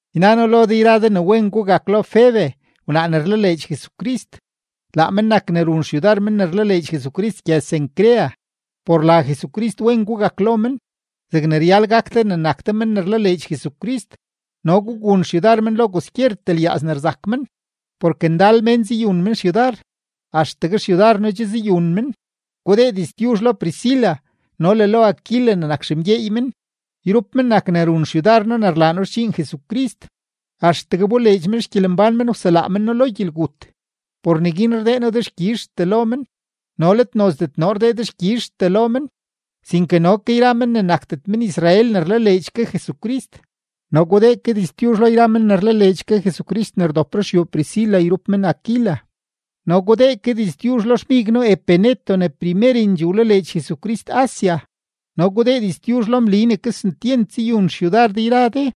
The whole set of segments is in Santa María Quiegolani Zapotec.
Yna noo lo de yra de ne wen gugak lo Febe wnaa ne rlaleedx Jesucrist, laa men nak ne run xyudar men ne rlaleedx Jesucrist gyëz-Cencrea. Por la Jesucrist wen gugak lo men zegne ryal gak de ne nak de men ne rlaleedx Jesucrist, no gugun xyudar men lo kwaskyertee lyaaz ne rzak men, porke ndal mén zayun men xyudar, axtegue xyudar noo che zayun men. Gudee diztyuzh lo Priscila no le lo Aquila ne nak xemgyeey men, yrup men nak ne run xyudar noo ne rlaa noo xdxiin Jesucrist. Axtegue wboleedx men xgyelembán men wselaa men noo lo gyelgut; por neguin rdee noo dexkyizhtee lo men, no let nozdet noo rdee dexkyizhtee lo men, sinke no ke yra men ne nakdet men-Israel ne rlaleedx ke Jesucrist. No gudee ke diztyuzh lo yra men ne rlaleedx ke Jesucrist men ne rdop ruxyuu Priscila yrup men Aquila. No gudee ke diztyuzh lo xmig noo Epeneto ne primerendxee wlaleedx Jesucrist Asia. No gudee diztyuzh lo Mli ne kesentyent zayun xyudar de yra de.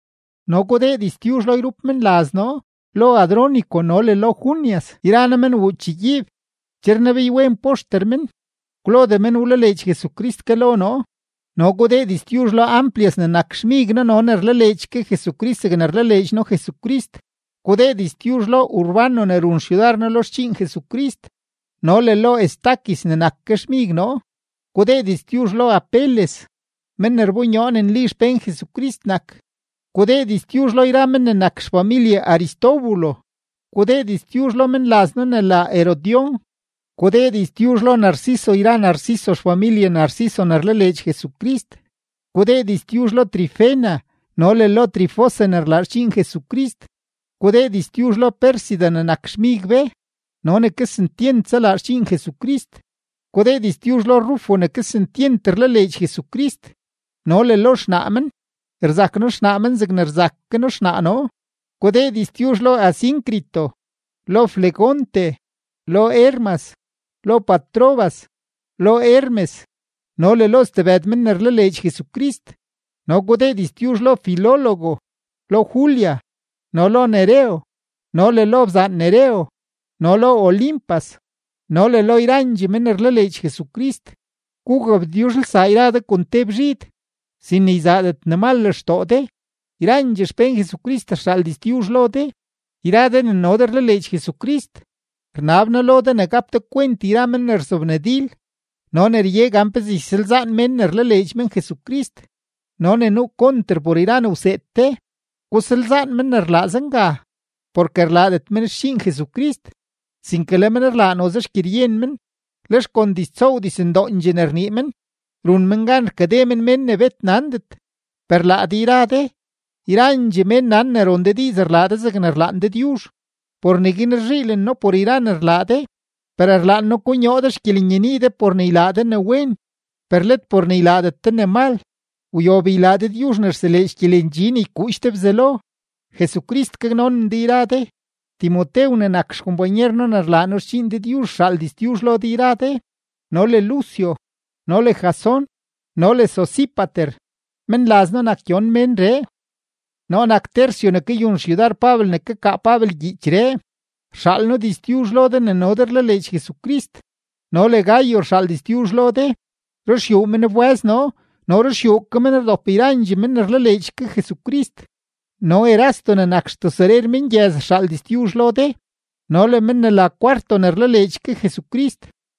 No gudee diztyuzh lo yrup menlaz noo, lo Andrónico no le lo Junias, yra noo men wuu chegyiib; che rnebeywen poxter men, kwlodee men wlaleedx Jesucrist ke lo noo. No gudee diztyuzh lo Amplias ne nak xmig noo no ne rlaleedx ke Jesucrist zegne rlaleedx ke noo Jesucrist. Gudee diztyuzh lo Urbano ne run xyudar noo lo xdxiin Jesucrist no le lo Estaquis ne nak ke xmig noo. Gudee diztyuzh lo Apeles, men ne rbonyoo ne nli xpén Jesucrist nak. Gudee diztyuzh lo yra men ne nak xfamilye Aristóbulo. Gudee diztyuzh lo menlaz noo ne la Herodión. Gudee diztyuzh lo Narciso yra Narciso xfamilye Narciso ne rlaleedx Jesucrist. Gudee diztyuzh lo Trifena no le lo Trifosa ne rlaa xdxiin Jesucrist. Gudee diztyuzh lo Pérsida ne nak xmig be no ne kesentyent zalaa xdxiin Jesucrist. Gudee diztyuzh lo Rufo ne kesentyent rlaleedx Jesucrist no le lo xnaa men, rzak noo xnaa men zegne rzak ke noo xnaa noo. Gudee diztyuzh lo Asíncrito, lo Flegonte, lo Hermas, lo Patrobas, lo Hermes no le lo stebëd men ne rlaleedx Jesucrist. No gudee diztyuzh lo Filólogo, lo Julia, no lo Nereo no le lo bzaan Nereo, no lo Olimpas no le lo yrandxee men ne rlaleedx Jesucrist. Gugabtyuzhelsaa yra de kon te bzhid, sin ne yzaadet ne mal lextoo de. Yrandxee xpén Jesucrist rxaal diztyuzh lo de. Yra de ne no de rlaleedx Jesucrist, rnab noo lo de ne gap de kwent yra men ne rzobnadil no ne rye gan pezee ysalzaan mén ne rlaleedx men Jesucrist no ne nuu konter por yra ne wseed de; gusalzaan men ne rlaa zenga. Porke rlaadet men xdxiin Jesucrist, sinke le men rlaa noze xgyeryen men, lex kon diztsoow dizndoondxee ne rnii men, run men gan rkade men mén ne bet nandet. Per laa de yra de, yrandxee mén nan ne ron de diiz rlaa de zegne rlaan Dëdyuzh. Por neguin rzhiilen noo por yra ne rlaa de; per rlaan noo konyoo de xgyelenyenii de por ne ylaa de ne wen, per let por ne ylaadet de ne mal. Wyob ylaa Dëdyuzh ne rseleedx gyelendxi ne ykuudx de Bzelo. Jesucrist gaknonen de yra de. Timotew ne nak xkompanyer noo ne rlaa noo xdxiin Dëdyuzh rxaal diztyuzh lo de yra de, no le Lucio, no le Jasón, no le Sosípater, menlaz noo nak gyon menree. Noo nak Tercio ne kayun xyudar Pabel ne kakaa Pabel gyiichree, rxaal noo diztyuzh lo de ne no de rlaleedx Jesucrist. No le Gayo rxaal diztyuzh lo de. Ruxyuu men wbë́z noo no ruxyuu ke men nak ne rdop yrandxee men ne rlaleedx ke Jesucrist. No Erasto ne nak xtesorer mengyëz rxaal diztyuzh lo de no le men ne la Cuarto ne rlaleedx ke Jesucrist.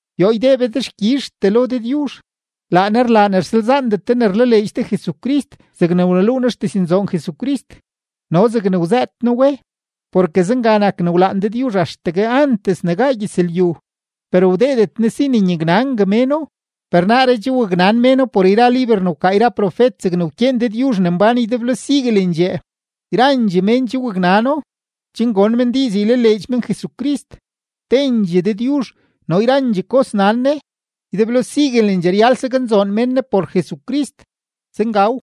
Yoo ydee be dexkyizhtee lo Dëdyuzh. Laa Ne rlaa ne rsalzaandet de ne rlaleedx de Jesucrist zegne wneluu noo xdiznzoon Jesucrist no zegne wzëët noo we; porke zenga nak ne wlaan Dëdyuzh axtegue antes ne gaa gyëzlyu, per wdeedet Ne si ne nyaknangue méno. Per naaree che waknan méno por yra liber ne wkaa yra profet zegne wkyeen Dëdyuzh ne mbán ydeblo siguelendxee. Yrandxee mén che waknano, chen gon men diiz ylaleedx men Jesucrist. Tendxee Dëdyuzh no yrandxee kos nan Ne. Ydeblo siguelendxee ryal ne saknzoon mén Ne por Jesucrist. Zengaw.